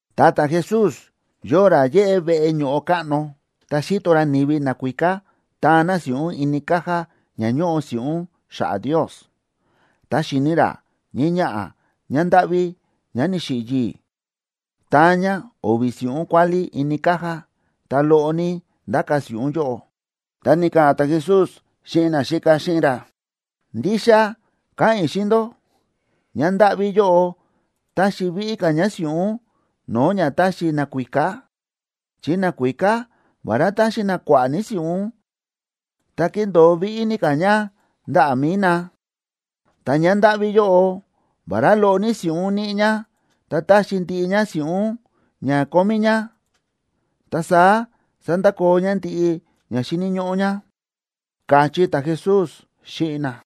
Ta ta̱Jesús yóo ra yéꞌé veꞌe ño̱ꞌo káꞌno, ta xi̱to ra ni̱vi nakuíká táan na si̱ꞌún ini caja ña ñóꞌo si̱ꞌún xa̱ꞌa̱ Ndios. Ta xi̱ni̱ ra ñii ñaꞌa̱ ñándáꞌví ñá ni̱xiꞌi̱ yii̱, táan ñá o̱vi̱ si̱ꞌún kuálí ini caja, ta loꞌo ní ndáka̱ si̱ꞌún yóꞌo. Ta ni̱ka̱ꞌa̱n ta̱Jesús xíꞌin naxíka xíꞌin ra: ―Ndixa káꞌa̱n i̱ xíꞌin ndó, ñándáꞌví yóꞌo ta̱xi víꞌí ka̱ ñá si̱ꞌún no̱o̱ ña ta̱xi nakuíká. Chi nakuíká, vará ta̱xi na kua̱ꞌa̱ ní si̱ꞌún, ta ki̱ndo̱o víꞌí ní ka̱ ña ndaꞌa̱ mi̱i na. Ta ñándáꞌví yóꞌo, vará loꞌo ní si̱ꞌún níꞌi ñá, ta ta̱xi ndiꞌi ñá si̱ꞌún ña kómí ñá, ta saá sa̱ndakoo ñá ndiꞌi ña xíni̱ ñóꞌó ñá ―káchí ta̱Jesús xíꞌin na.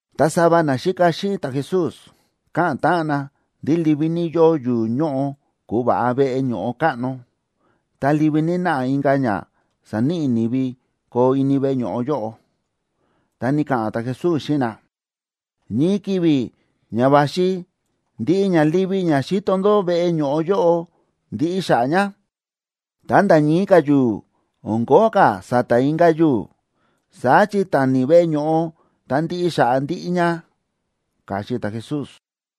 Ta sava naxíka xíꞌin ta̱Jesús káꞌa̱n táꞌan na ndí livi ní yóo yu̱u̱ ñóꞌo ku̱va̱ꞌa veꞌe ño̱ꞌo káꞌno, ta livi ní náꞌa inka̱ ña sa̱níꞌi ni̱vi koo ini veꞌe ño̱ꞌo yóꞌo. Ta ni̱ka̱ꞌa̱n ta̱Jesús xíꞌin na: ―Ñii ki̱vi̱ ña va̱xi ndiꞌi ña livi ña xíto ndó veꞌe ño̱ꞌo yóꞌo, ndiꞌi xa̱ꞌa̱ ña, ta nda̱ ñii ka̱ yu̱u̱, o̱n kóo ka̱ sa̱ta̱ inka̱ yu̱u̱. Saá chi tani veꞌe ño̱ꞌo ta ndiꞌi xa̱ꞌa̱ ndiꞌi ña ―káchí ta̱Jesús.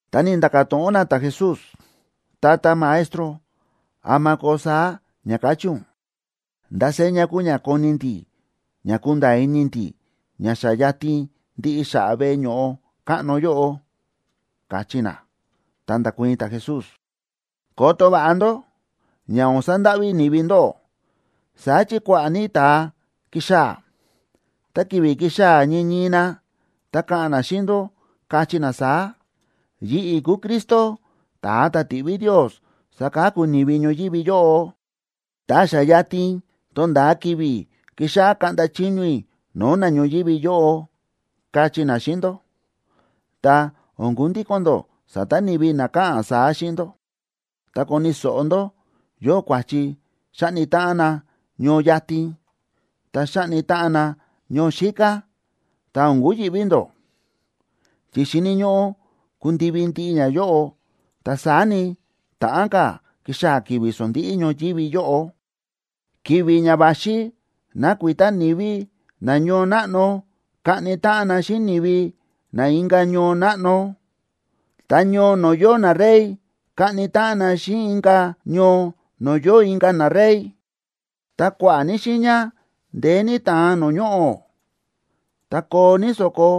Ta ni̱nda̱ka̱ to̱ꞌon na ta̱Jesús: ―Tata Maestro, ¿ama koo saá ña ka̱chí ún? ¿Ndá seña kuu ña koni ndi̱ ña kunda̱a̱ ini ndi̱ ña xa yatin ndiꞌi xa̱ꞌa̱ veꞌe ño̱ꞌo káꞌno yóꞌo? ―káchí na. Ta nda̱kuii̱n ta̱Jesús: ―Koto va̱ꞌa ndó ña o̱n sandáꞌví ni̱vi ndóꞌó. Saá chi kua̱ꞌa̱ ní ta̱a kixaa̱, ta ki̱vi̱ kixaa̱ ñii ñii na, ta ka̱ꞌa̱n na xíꞌin ndó, kachí na saá: “Yi̱ꞌi̱ kúu Cristo, ta̱a ta̱ ti̱ꞌví Ndios saka̱ku ni̱vi ñoyívi yóꞌo, ta xa yatin tonda̱a ki̱vi̱ kixáꞌá kaꞌnda chiño i̱ no̱o̱ na ñoyívi yóꞌo”, kachí na xíꞌin ndó. Ta o̱n kundíko̱n ndó sa̱ta̱ ni̱vi na káꞌa̱n saá xíꞌin ndó. Ta koni̱ so̱ꞌo ndó yóo kua̱chi xáꞌni táꞌan na ñoo yatin, ta xáꞌni táꞌan na ñoo xíká, ta o̱n kuyi̱ꞌví ndó. Chi xíni̱ ñóꞌó kundivi ndiꞌi ñayóꞌo, ta saá ni, ta̱ꞌán ka̱ kixaa̱ ki̱vi̱ sondíꞌí ñoyívi yóꞌo. ’Ki̱vi̱ ña va̱xi nakuita ni̱vi na ñoo náꞌno kaꞌni táꞌan na xíꞌin ni̱vi na inka̱ ñoo náꞌno, ta ñoo no̱o̱ yóo narey kaꞌni táꞌan na xíꞌin inka̱ ñoo no̱o̱ yóo inka̱ narey. Ta kua̱ꞌa̱ ní xiiña ndeé ní ta̱an no̱o̱ ñoꞌo̱, ta koo ní so̱ko,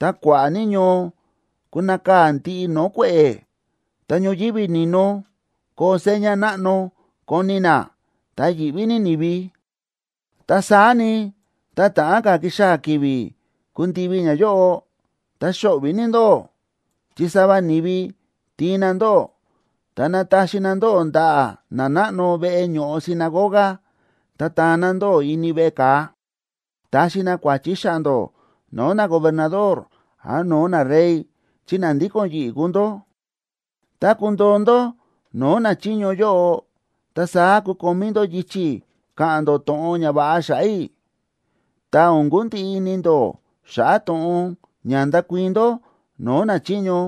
ta kua̱ꞌa̱ ní ñoo kunakaa̱ ndiꞌi no̱o̱ kue̱ꞌe̱, ta ñoyívi ni̱no koo seña náꞌno koni na, ta yi̱ꞌví ní ni̱vi. ’Ta saá ni, tá ta̱ꞌán ka̱ kixaa̱ ki̱vi̱ kundivi ñayóꞌo, ta xo̱ꞌvi̱ ní ndóꞌó, chi sava ni̱vi tiin na ndóꞌó, ta nataxi na ndóꞌó ndaꞌa̱ nanáꞌno veꞌe ño̱ꞌo sinagoga, ta taan na ndóꞌó ini veꞌe ka̱a. Taxi na kua̱chi xa̱ꞌa̱ ndó no̱o̱ nagobernador án no̱o̱ narey chi na ndíko̱n yi̱ꞌi̱ kúu ndó. Tá kundoo ndó no̱o̱ nachiño yóꞌo, ta saá kukomí ndó yichi̱ ka̱ꞌa̱n ndó to̱ꞌon ñava̱ꞌa xa̱ꞌa̱ i̱. Ta o̱n kundiꞌi ini ndó xa̱ꞌa̱ to̱ꞌon ña ndakuii̱n ndó no̱o̱ nachiño,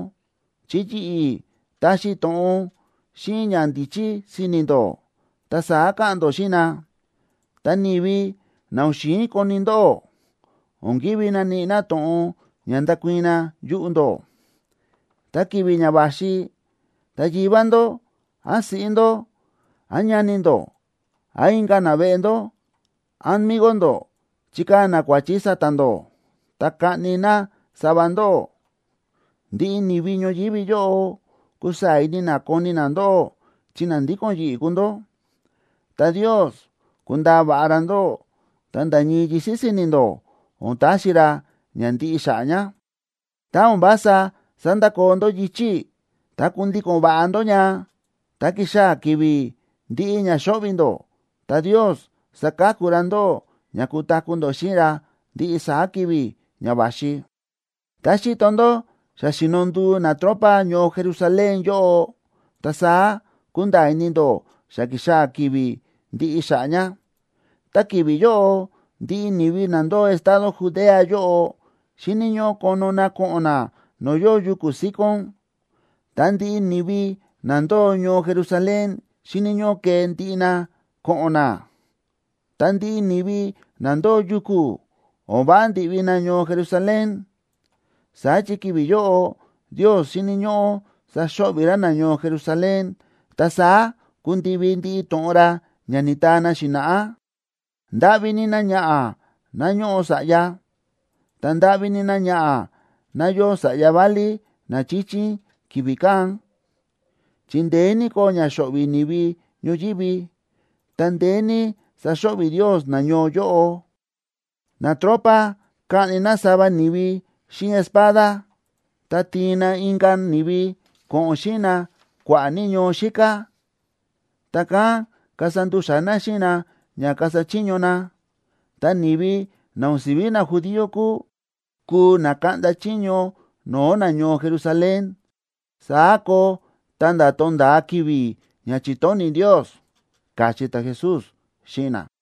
chi yi̱ꞌi̱ taxi i̱ to̱ꞌon xíꞌin ñandíchí si̱ni̱ ndó, ta saá ka̱ꞌa̱n ndó xíꞌin na. Ta ni̱vi na o̱n xi̱in koni ndóꞌó, o̱n kívi naníꞌi na to̱ꞌon ña ndakuii̱n na yuꞌu̱ ndó. Ta ki̱vi̱ ña va̱xi, ta yivá ndó, án siꞌí ndó, án ñani ndó, án inka̱ naveꞌe ndó, án migo ndó chikaa̱ na kua̱chi sa̱ta̱ ndó, ta kaꞌni na sava ndóꞌó. Ndiꞌi ni̱vi ñoyívi yóꞌo kusaa̱ ini na koni na ndóꞌó chi na ndíko̱n yi̱ꞌi̱ kúu ndó. Ta Ndios kundaa va̱ꞌa ra ndóꞌó, ta nda̱ ñii yisi̱ si̱ni̱ ndó, o̱n taxi ra ña ndiꞌi xa̱ꞌa̱ ña. Tá o̱n vása sandakoo ndó yichi̱ i̱, ta kundíko̱n va̱ꞌa ndó ña, nda̱ kixaa̱ ki̱vi̱ ndi̱ꞌi ña xo̱ꞌvi̱ ndó, ta Ndios saka̱ku ra ndóꞌó ña kutaku̱ ndó xíꞌin ra ndiꞌi saá ki̱vi̱ ña va̱xi. ’Tá xíto ndó xa xíno nduu natropa ñoo Jerusalén yóꞌo, ta saá kunda̱a̱ ini ndó xa ki̱xaa̱ ki̱vi̱ ndiꞌi xa̱ꞌa̱ ña. Tá ki̱vi̱ yóꞌo, ndiꞌi ni̱vi na ndóo estado Judea yóꞌo, xíni̱ ñóꞌó kono na ko̱ꞌo̱n na no̱o̱ yóo yuku̱ síkón. Ta ndiꞌi ni̱vi na ndóo ñoo Jerusalén xíni̱ ñóꞌó kee ndiꞌi na ko̱ꞌo̱n na. Ta ndiꞌi ni̱vi na ndóo yuku̱, o̱n váꞌa ndi̱ꞌvi na ñoo Jerusalén. Saá chi ki̱vi̱ yóꞌo Ndios xíni̱ ñóꞌó saxo̱ꞌvi̱ ra nañoo Jerusalén, ta saá kundivi ndiꞌi to̱ꞌon ra ña ni̱taa na xi̱na̱ꞌá. ¡Ndáꞌví ní náñaꞌa̱ ná ñóꞌo sa̱ꞌya, ta ndáꞌví ní náñaꞌa̱ ná yóo sa̱ꞌya válí na chíchín ki̱vi̱ kán!, chi ndeé ní koo ña xo̱ꞌvi̱ ni̱vi ñoyívi, ta ndeé ní saxo̱ꞌvi̱ Ndios nañoo yóꞌo. Natropa kaꞌni na sava ni̱vi xíꞌin espada, ta tiin na inka̱ ni̱vi ko̱ꞌo̱n xíꞌin na kua̱ꞌa̱ ní ñoo xíká, ta kán kasa ndu̱xa̱ na xíꞌin na ña kasa chiño na. Ta ni̱vi na o̱n si̱ví najudío kúu, kuu na kaꞌnda chiño no̱o̱ nañoo Jerusalén. Saá koo ta̱nda̱ tonda̱a ki̱vi̱ ña chi̱tóni̱ Ndios ―káchí ta̱Jesús xíꞌin na.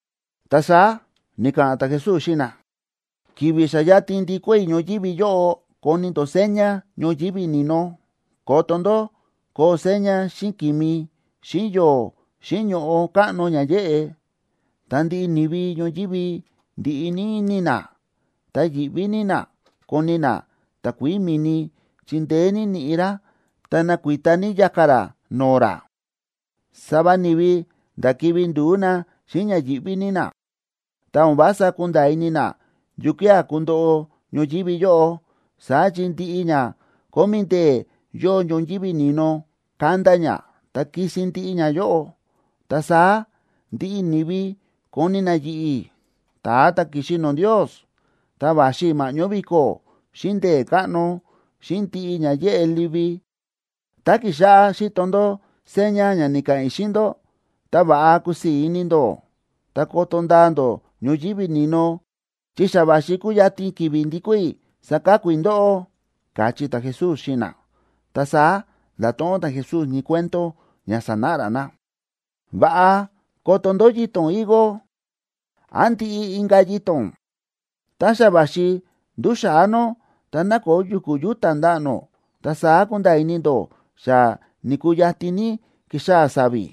Ta saá ni̱ka̱ꞌa̱n ta̱Jesús xíꞌin na: ―Ki̱vi̱ xa yatin ndikó i̱ ñoyívi yóꞌo koni ndó seña ñoyívi ni̱no: koto ndó koo seña xíꞌin ki̱mi, xíꞌin yo̱o̱, xíꞌin ño̱ꞌo káꞌno ña yéꞌe. Ta ndiꞌi ni̱vi ñoyívi ndiꞌi ní ini na, ta yi̱ꞌví ní na koni na takuií mi̱ni, chi ndeé ní ni̱ꞌi̱ rá ta nakuita ní ya̱ka̱ rá no̱o̱ rá. Sava ni̱vi nda̱ kivi̱ ndu̱ú na xíꞌin ña yíꞌví ní na, ta o̱n vása kunda̱a̱ ini na yukía̱ kundoꞌo ñoyívi yóꞌo. Saá chi ndiꞌi ña kómí ndee̱ yóo ñoyívi ni̱no kanda ña ta kisin ndiꞌi ñayóꞌo. Ta saá ndiꞌi ni̱vi koni na yi̱ꞌi̱, ta̱a ta̱ ki̱xi no̱o̱ Ndios, ta va̱xi i̱ ma̱ꞌñó vi̱ko̱, xíꞌin ndee̱ káꞌno, xíꞌin ndiꞌi ña yéꞌe livi. Tá kíxáꞌá xíto ndó seña ña ni̱ka̱ꞌa̱n i̱ xíꞌin ndó, ta va̱ꞌa kusii̱ ní ini ndó, ta koto ndaa ndó ñoyívi ni̱no, chi xa va̱xi kuyatin ki̱vi̱ ndikó i̱ saka̱ku i̱ ndóꞌó ―káchí ta̱Jesús xíꞌin na. Ta saá nda̱to̱ꞌon ta̱Jesús ñii cuento ña sanáꞌa ra na: ―Va̱ꞌa koto ndó yito̱n higo, án ndiꞌi inka̱ yito̱n. Tá xa va̱xi nduxa̱á nó ta nákoo yu̱ku̱ yúta̱ ndaꞌa̱ nó, ta saá kúnda̱a̱ ini ndó xa ni̱kuu yatin ní kixaa̱ sa̱vi̱.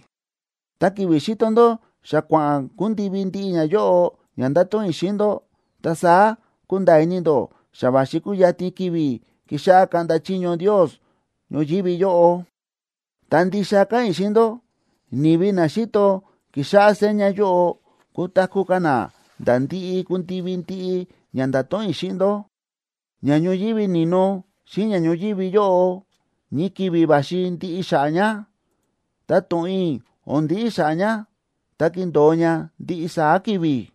Ta ki̱vi̱ xíto ndó xa kua̱ꞌa̱n kundivi ndiꞌi ñayóꞌo ña nda̱to̱ꞌon i̱ xíꞌin ndó, ta saá kunda̱a̱ ini ndó xa va̱xi kuyatin ki̱vi̱ kixáꞌá kaꞌnda chiño Ndios ñoyívi yóꞌo. ’Ta ndixa káꞌa̱n i̱ xíꞌin ndó, ni̱vi na xíto kixáꞌá seña yóꞌo kutaku̱ ka̱ na nda̱ ndi̱ꞌi ku̱ndivi ndiꞌi ña nda̱to̱ꞌon i̱ xíꞌin ndó. Ña ñoyívi ni̱no xíꞌin ña ñoyívi yóꞌo ñii ki̱vi̱ va̱xi ndiꞌi xa̱ꞌa̱ ña, ta to̱ꞌon i̱ o̱n ndiꞌi xa̱ꞌa̱ ña, ta kindo̱o ña ndiꞌi saá ki̱vi̱.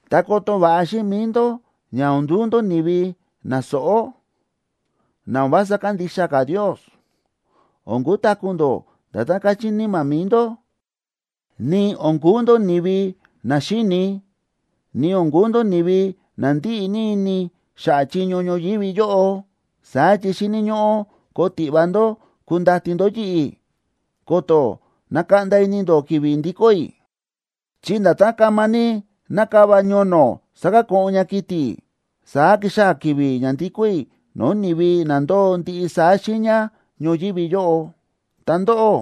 ’Ta koto va̱ꞌa xíꞌin mi̱i ndó ña o̱n nduu ndó ni̱vi na sóꞌó, na o̱n vása kandixa ka̱ Ndios. O̱n kutaku̱ ndó nda̱tán káchí níma̱ mi̱i ndó, ni o̱n kuu ndó ni̱vi na xíini, ni o̱n kuu ndó ni̱vi na ndíꞌi ní ini xa̱ꞌa̱ chiño ñoyívi yóꞌo. Saá chi xíni̱ ñóꞌó koo tiꞌva ndó kundati ndó yi̱ꞌi̱, ko̱to̱ nakaꞌnda ini ndó ki̱vi̱ ndikó i̱. Chi nda̱tán kama ní nákava ñono̱ sakako̱ꞌon ña kiti̱, saá kixaa̱ ki̱vi̱ ña ndikó i̱ no̱o̱ ni̱vi na ndóo ndiꞌi saá xiiña ñoyívi yóꞌo. Ta ndóꞌó,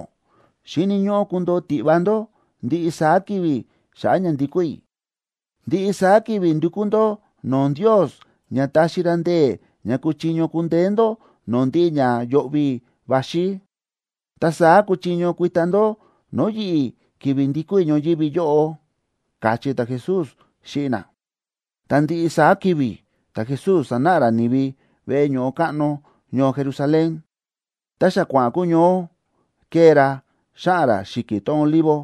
xíni̱ ñóꞌó kundoo tiꞌva ndó ndiꞌi saá ki̱vi̱ xa̱ꞌa̱ ña ndikó i̱. Ndiꞌi saá ki̱vi̱ ndukú ndó no̱o̱ Ndios ña taxi ra ndee̱ ña kuchiño kundeé ndó no̱o̱ ndiꞌi ña yo̱ꞌvi̱ va̱xi, ta saá kuchiño kuita ndó no̱o̱ yi̱ꞌi̱ ki̱vi̱ ndikó i̱ ñoyívi yóꞌo ―káchí ta̱Jesús xíꞌin na. Ta ndiꞌi saá ki̱vi̱ ta̱Jesús sánáꞌa ra ni̱vi veꞌe ño̱ꞌo káꞌno ñoo Jerusalén, ta xa kua̱ꞌa̱n kuñoó, kée ra xáꞌa̱n ra xi̱ki̱ tón Olivo.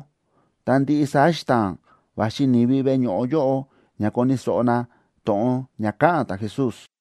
Ta ndiꞌi saá xita̱a̱n va̱xi ni̱vi veꞌe ño̱ꞌo yóꞌo ña koni̱ so̱ꞌo na to̱ꞌon ña káꞌa̱n ta̱Jesús.